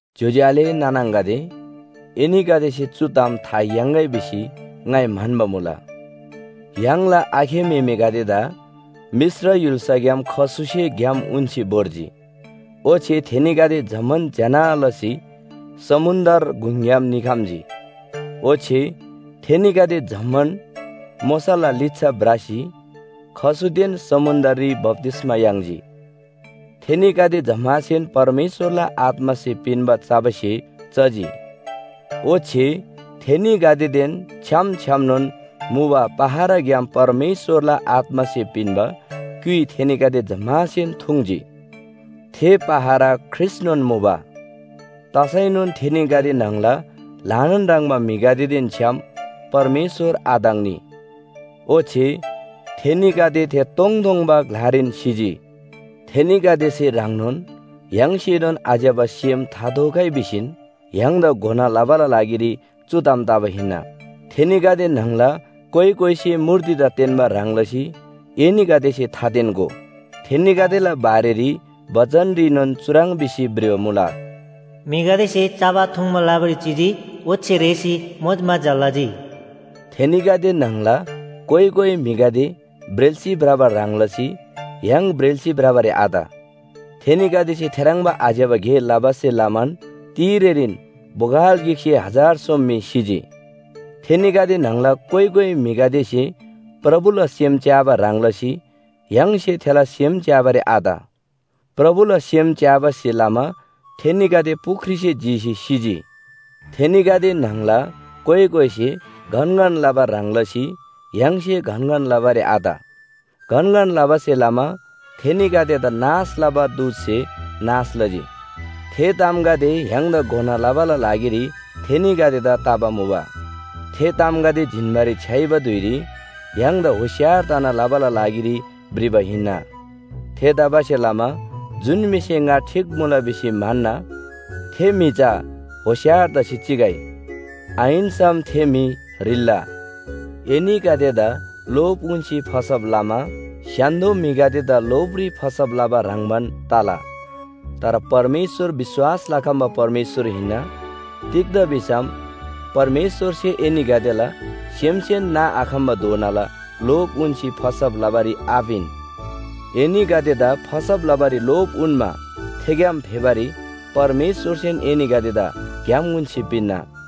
ज्‍योज्‍यो आले नाना आङागदे, एनीगदेसे चु ताम था याङ्‌गै भिसी ङाइ म्‍हन्‍बा मुला। य्‍हाङला आखे म्‍हेमेगदेदा मिश्र य्‍हुल्‍साग्‍याम खसुसे ग्‍याम उन्‍सी भोर्जी। ओच्‍छे थेनीगदे जम्‍मान ज्‍यना लसी समुन्‍द्र गुङग्‍याम निखम्‍जी। ओच्‍छे थेनीगदे जम्‍मान मोशाला लिच्‍छा भ्रसी खसुदेन समुन्‍द्ररी बप्‍तिस्‍मा याङ्जी। थेनीगदे जम्‍मासेन परमेश्‍वरला आत्‍मासे पिन्‍बा चबा स्‍हे चजी। ओच्‍छे थेनीगदेदेन छ्‌याम छ्‌यामनोन मुबा पहराग्‍याम परमेश्‍वरला आत्‍मासे पिन्‍बा क्‍युइ थेनीगदे जम्‍मासेन थुङ्‌जी। थे पहरा ख्रीष्‍टनोन मुबा। तसैनोन थेनीगदे न्‍हङला ल्‍हानान ह्रङ्‌बा म्‍हिगदेदेन छ्‌याम परमेश्‍वर आताङ्‌नी। ओच्‍छे थेनीगदे थे तोङतोङबा ग्‍लारीन सिजी। थेनीगदेसे ह्रङ्नोन य्‍हाङसेनोन आज्‍यबा सेम थाथोगै भिसीन य्‍हाङदा घोना लबाला लागिरी चु ताम तबा हिन्‍ना। थेनीगदे न्‍हङला कोइ कोइसे मूर्तिदा तेन्‍बा ह्रङ् लसी एनीगदेसे थातेन्‍गो। थेनीगदेला बारेरी बचनरीनोन चुह्रङ् भिसी भ्रिबा मुला, “म्‍हिगदेसे चबा थुङ्बा लबारी चिजी ओच्‍छे रेःसी मोजमजा लजी।” थेनीगदे न्‍हङला कोइ कोइ म्‍हिगदे ब्रेल्‍सी भ्रबा ह्रङ् लसी य्‍हाङ ब्रेल्‍सी भ्रबारी आत। थेनीगदेसे थेह्रङ्बा आज्‍यबा गे लबासे लमान तिरेरीन बोगल गिकसे हजार सोम म्‍हि सिजी। थेनीगदे न्‍हङला कोइ कोइ म्‍हिगदेसे प्रभुला सेम च्‍याबा ह्रङ् लसी य्‍हाङसे थेला सेम च्‍याबारी आत। प्रभुला सेम च्‍याबासे लमा थेनीगदे पुख्रीसे जीसी सिजी। थेनीगदे न्‍हङला कोइ कोइसे गनगन लबा ह्रङ् लसी य्‍हाङसे गनगन लबारी आत। गनगन लबासे लमा थेनीगदेदा नाश लबा दूतसे नाश लजी। थे तामगदे य्‍हाङदा घोना लबाला लागिरी थेनीगदेदा तबा मुबा। थे तामगदे जिन्‍बारी छ्‌याइबा धुइरी य्‍हाङदा होशियार तना लबाला लागिरी भ्रिबा हिन्‍ना। थेतबासेलमा जुन म्‍हिसे ङा ठीक मुला भिसी म्‍हन्‍ना, थे म्‍हि चा होशियार तसी चिगै। आहिन्‍सम थे म्‍हि ह्रिल्‍ला। एनीगदेदा लोभ उन्‍सी फसब लमा स्‍य्‍हान्‍दो म्‍हिगदेदा लोभरी फसब लबा ह्रङ्‌बान तला। तर परमेश्‍वर विश्‍वास लखम्‍बा परमेश्‍वर हिन्‍ना, तिग्‍दा भिसम परमेश्‍वरसे एनीगदेला सेमसेन नाआखम्‍बाधोनाला लोभ उन्‍सी फसब लबारी आपिन। एनीगदेदा फसब लबारी लोभ उन्‍मा थेग्‍याम फेबारी परमेश्‍वरसेन एनीगदेदा ग्‍याम उन्‍सी पिन्‍ना।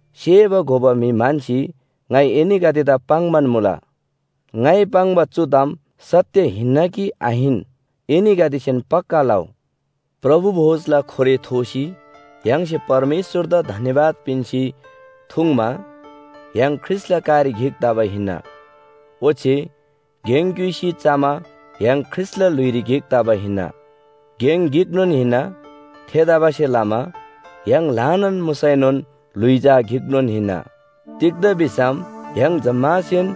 सेबा घोबा म्‍हि म्‍हन्‍सी ङाइ एनीगदेदा पाङ्‌बान मुला। ङाइ पाङ्बा चु ताम सत्‍य हिन्‍ना कि आहिन, एनीगदेसेन पक्‍का लउ। प्रभु भोजला खोरे थोसी य्‍हाङसे परमेश्‍वरदा धन्‍यवाद पिन्‍सी थुङ्मा य्‍हाङ ख्रीष्‍टला कारी गिक तबा हिन्‍ना। ओच्‍छे गेङ क्‍युइसी चमा य्‍हाङ ख्रीष्‍टला ल्‍हुइरी गिक तबा हिन्‍ना। गेङ गिकनोन हिन्‍ना, थेतबासेलमा य्‍हाङ ल्‍हानान मुसैनोन ल्‍हुइ चा गिकनोन हिन्‍ना। तिग्‍दा भिसम य्‍हाङ जम्‍मासेन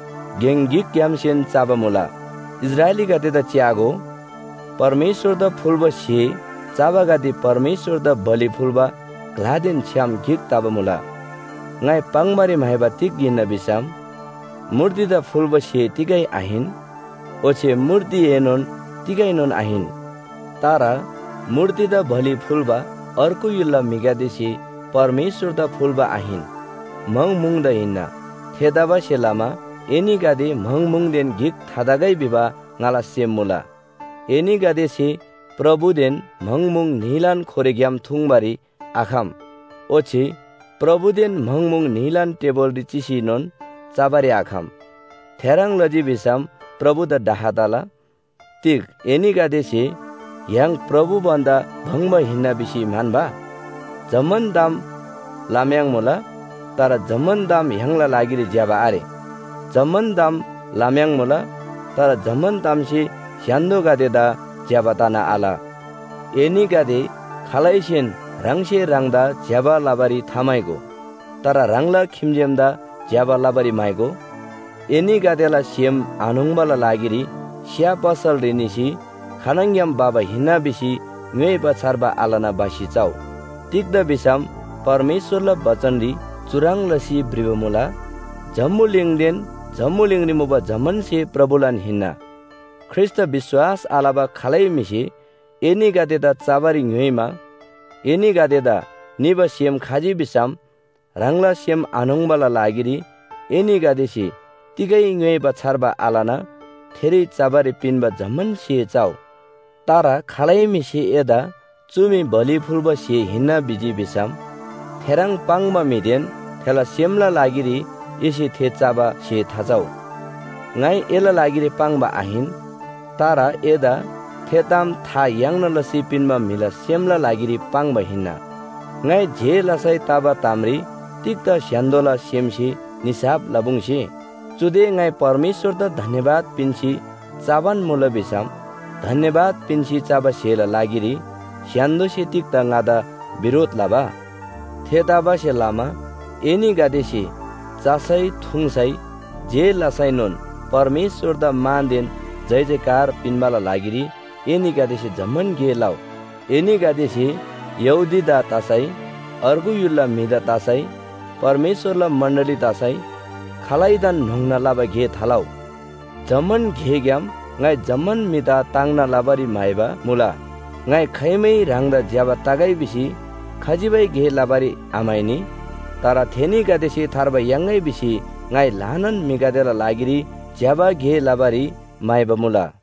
गेङ गिकग्‍यामसेन चबा मुला। इस्राएलीगदेदा च्‍यागो, परमेश्‍वरदा फुल्‍बा स्‍हे चबागदे परमेश्‍वरदा बलि फुल्‍बा ग्‍लादेन छ्‌याम गिक तबा मुला। ङाइ पाङ्‌बारी म्‍हाइबा तिग हिन्‍ना भिसम, मूर्तिदा फुल्‍बा स्‍हे तिगै आहिन, ओच्‍छे मूर्तिएनोन तिगैनोन आहिन। तर मूर्तिदा बलि फुल्‍बा अर्गु य्‍हुलला म्‍हिगदेसे परमेश्‍वरदा फुल्‍बा आहिन, म्‍हङ म्‍हुङदा हिन्‍ना। थेतबासेलमा एनीगदे म्‍हङ म्‍हुङदेन गिक थातगै भिबा ङाला सेम मुला। एनीगदेसे प्रभुदेन म्‍हङ म्‍हुङ न्‍हीलान खोरेग्‍याम थुङ्बारी आखम। ओच्‍छे प्रभुदेन म्‍हङ म्‍हुङ न्‍हीलान टेबुलरी चिसीनोन चबारी आखम। थेह्रङ् लजी भिसम प्रभुदा डाह तला। तिग एनीगदेसे य्‍हाङ प्रभु भन्‍दा भङ्‍बा हिन्‍ना भिसी म्‍हन्‍बा? जम्‍मान ताम लम्‍याङ्‌मुला, तर जम्‍मान ताम य्‍हाङला लागिरी ज्‍यबा आरे। जम्‍मान ताम लम्‍याङ्‌मुला, तर जम्‍मान तामसे स्‍य्‍हान्‍दोगदेदा ज्‍यबा तना आल। एनीगदे खालैसेन ह्राङसे ह्राङदा ज्‍यबा लबारी थाम्‍हाइगो। तर ह्राङला खिम्‍जेमदा ज्‍यबा लबारी म्‍हाइगो। एनीगदेला सेम आन्‍होङ्‌बाला लागिरी स्‍या पसलरी निसी खानङग्‍याम भबा हिन्‍ना भिसी ङ्‌योइबा छार्बा आलना भसी चउ। तिग्‍दा भिसम परमेश्‍वरला बचनरी चुह्रङ् लसी भ्रिबा मुला, “जम्‍बुलिङदेन जम्‍बुलिङरी मुबा जम्‍मान स्‍हे प्रभुलान हिन्‍ना।” ख्रीष्‍टदा विश्‍वास आलबा खालै म्‍हिसे एनीगदेदा चबारी ङ्‌योइमा एनीगदेदा निबा सेम खजी भिसम ह्राङला सेम आन्‍होङ्‌बाला लागिरी एनीगदेसे तिगै ङ्‌योइबा छार्बा आलना थेरी चबारी पिन्‍बा जम्‍मान स्‍हे चउ। तर खालै म्‍हिसे एदा “चु मी बलि फुल्‍बा स्‍हे हिन्‍ना” भिजी भिसम थेह्रङ् पाङ्बा म्‍हिदेन थेला सेमला लागिरी एसे थे चबा स्‍हे थाचउ। ङाइ एला लागिरी पाङ्बा आहिन, तर एदा थे ताम था याङ्ना लसी पिन्‍बा म्‍हिला सेमला लागिरी पाङ्बा हिन्‍ना। ङाइ जे लसै तबा तामरी तिग्‍दा स्‍य्‍हान्‍दोला सेमसे निसाफ लपुङ्‌से? चुदे ङाइ परमेश्‍वरदा धन्‍यवाद पिन्‍सी चबान मुला भिसम धन्‍यवाद पिन्‍सी चबा स्‍हेला लागिरी स्‍य्‍हान्‍दोसे तिग्‍दा ङादा बिरोध लबा? थेतबासेलमा एनीगदेसे चसै, थुङ्‌सै, जे लसैनोन परमेश्‍वरदा मानदेन जयजयकार पिन्‍बाला लागिरी एनीगदेसे जम्‍मान गे लउ। एनीगदेसे यहूदीदा तसै, अर्गु य्‍हुलला म्‍हिदा तसै, परमेश्‍वरला मण्‍डली तसै खालैदान न्‍होङ्ना लबा गे थालउ। जम्‍मान गेग्‍याम ङाइ जम्‍मान म्‍हिदा ताङ्ना लबारी म्‍हाइबा मुला। ङाइ खाइमै ह्राङदा ज्‍यबा तगै भिसी खजिबै गे लबारी आम्‍हाइनी। तर थेनीगदेसे थार्बा याङ्‌गै भिसी ङाइ ल्‍हानान म्‍हिगदेला लागिरी ज्‍यबा गे लबारी म्‍हाइबा मुला।